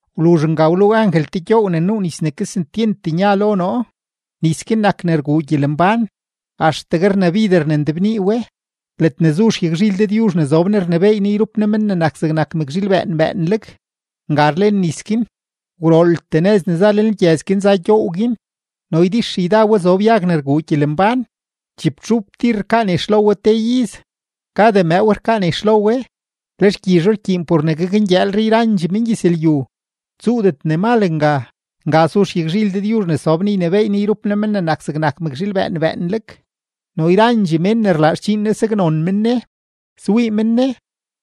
Wluzh nga wluu angel te gyoow ne nuu nis ne kesentyent nya lo noo, nis guin nak ne rguu gyelembán; axtegue rnabider ne ndebnii we; ledne zu xyagzhil Dëdyuzh ne zob Ne rnebééy Ne yrup Ne Men ne nak zegnak mëkzhiil bëën bëënleg, nga rlen nis guin. Gwrooltee nëz ne za lenlgyëz guin za gyoow guin no ydixyda we zob yag ne rguu gyelembán; chibtxup tir rkaa nex lo we te iz, kada mëëw rkaa nex lo we, le xgyizho rkyiin por ne gakngyëëlre yrandxee mengyëzlyu. Tsuudet ne mal nga. Nga su xyagzhil Dëdyuzh ne sob Ne ynebééy Ne yrup Ne Men ne nak zegnak mëkzhiil bëën bëënleg, no yrandxee mén ne rlaa xdxiin Ne saknon men Ne. Swii men Ne,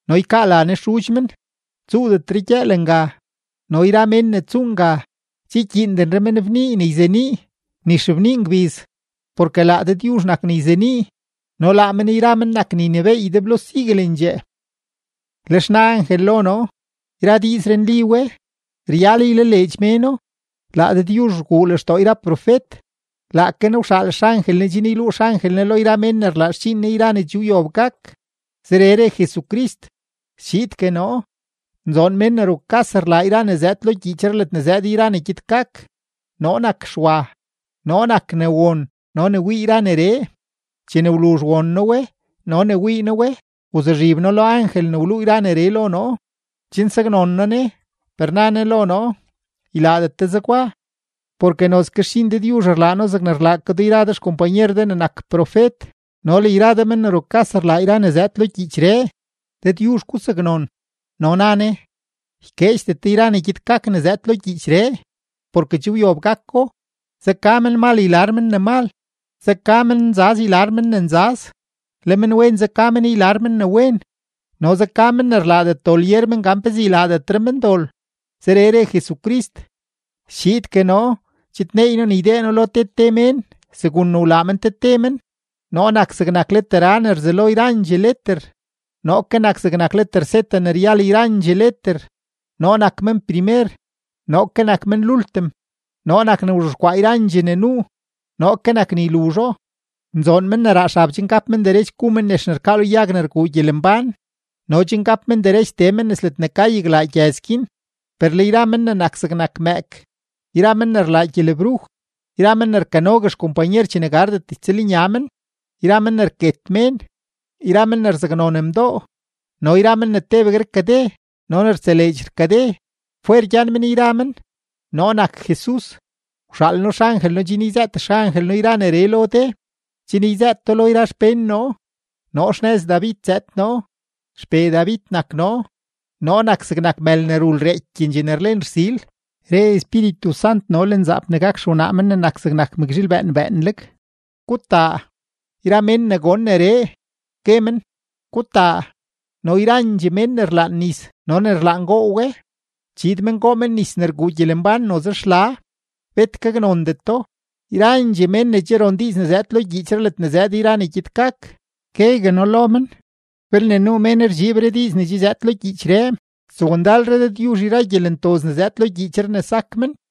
no ykaa la Ne xudx men. Tsuudetre gyëël nga, no yra mén ne tsuu nga, che ykyiindenre men bnii ne yzenii ni xebnii ngbiz, porke laa Dëdyuzh nak ne yzenii, no laa men yra men nak ne ynebééy ydeblo siguelendxee. Lex na angel lo noo: ―Yra diizree nli we; ryal ylaleedx méno. Laa Dëdyuzh rguu lextoo yra profet, laake Ne wxaal xangel Ne chen yluu xangel Ne lo yra mén ne rlaa xdxiin Ne yra ne che wyob gak. Zeree re Jesucrist: ―¡Schiidgue noo! Nzoon mén ne rukas rlaa yra ne zëëd lo gyiichree ledne zëëd yra ne gyed gak. Noo nak Xwa, noo nak ne won no ne wii yra neree. Chene wluzh won noo we no ne wii noo we, wzuzhib noo lo angel ne wluu yra neree lo noo, chen saknon noo ne. Per na ne lo noo: ―Ylaadet de zegwa, porke nozke xdxiin Dëdyuzh rlaa noo zegne rlaa ke do yra de xkompanyer de ne nak profet no le yra de men ne rukas rlaa yra ne zëëd lo gyiichree. Dëdyuzh gusaknon. No na ne: ―Ykeedxdet de yra ne gyed gak ne zëëd lo gyiichree, porke che wyob gako. Zeka menmal ylar men ne mal, zeka mennzaz ylar men ne nzaz, le menwen zeka men ylar men ne wen, no zeka men ne rlaadet dol yer men gan pezee ylaadetre men dol. Zeree re Jesucrist: ―Schiidgue noo, chidneey noo ne ydee noo lo te te mén, segun ne wlaa men te te men. Noo nak zegnak leter A ne rzelo yrandxee leter, noo ke nak zegnak leter Z ne ryal yrandxee leter; noo nak men primer, noo ke nak men lultim; noo nak ne wzhexkwaa yrandxee ne nuu, noo ke nak ne yluzho. Nzoon men ne raa xab chen gap men derech gu men nex ne rkaa lo yag ne rguu gyelembán no chen gap men derech tee men nes ledne ka yaglaa gyëz guin. Per le yra men ne nak zegnak mëëk, yra men ne rlaa gyelebruj, yra men ne rkanogue xkompanyer chene gardet ytsëlnya men, yra men ne rket mén, yra men ne rzaknon mdoo, no yra men ne tebegue rkade no ne rtseleedx rkade, fwer gyan men yra men. ―Noo nak Jesus, wxaal noo xangel noo chen yzëët xangel noo yra neree lo de, chen yzëët do lo yra xpén noo. Noo xnëz David zëëd noo, XPee David nak noo, noo nak zegnak mël ne rul reekyendxee ne rlen rsil. Re Espíritu Sant no le nzaap ne gak xewnaa Men ne nak zegnak mëkzhiil bëën bëënleg: ―Gutaa. Yra mén ne gon neree, gue men: ―Gutaa. No yrandxee mén ne rlaan nis no ne rlaan goo we, chiid men goo men nis ne rguu gyelembán noze xla, bet gaknondeto. Yrandxee mén ne che ron diiz ne zëëd lo gyiichree ledne zëëd yra ne gyed gak, guegue noo lo men: Belne nuu mén rdxiibre diiz ne che zëëd lo gyiichree, stsowndalre Dëdyuzh yra gyelentoz ne zëëd lo gyiichree ne sak men.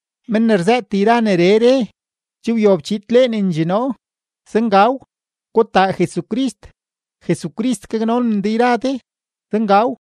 Men ne rzëët yra neree re: ―Che wyob chidleenendxee noo. Zengaw. ¡Gutaa Jesucrist! Jesucrist gaknonen de yra de. Zengaw.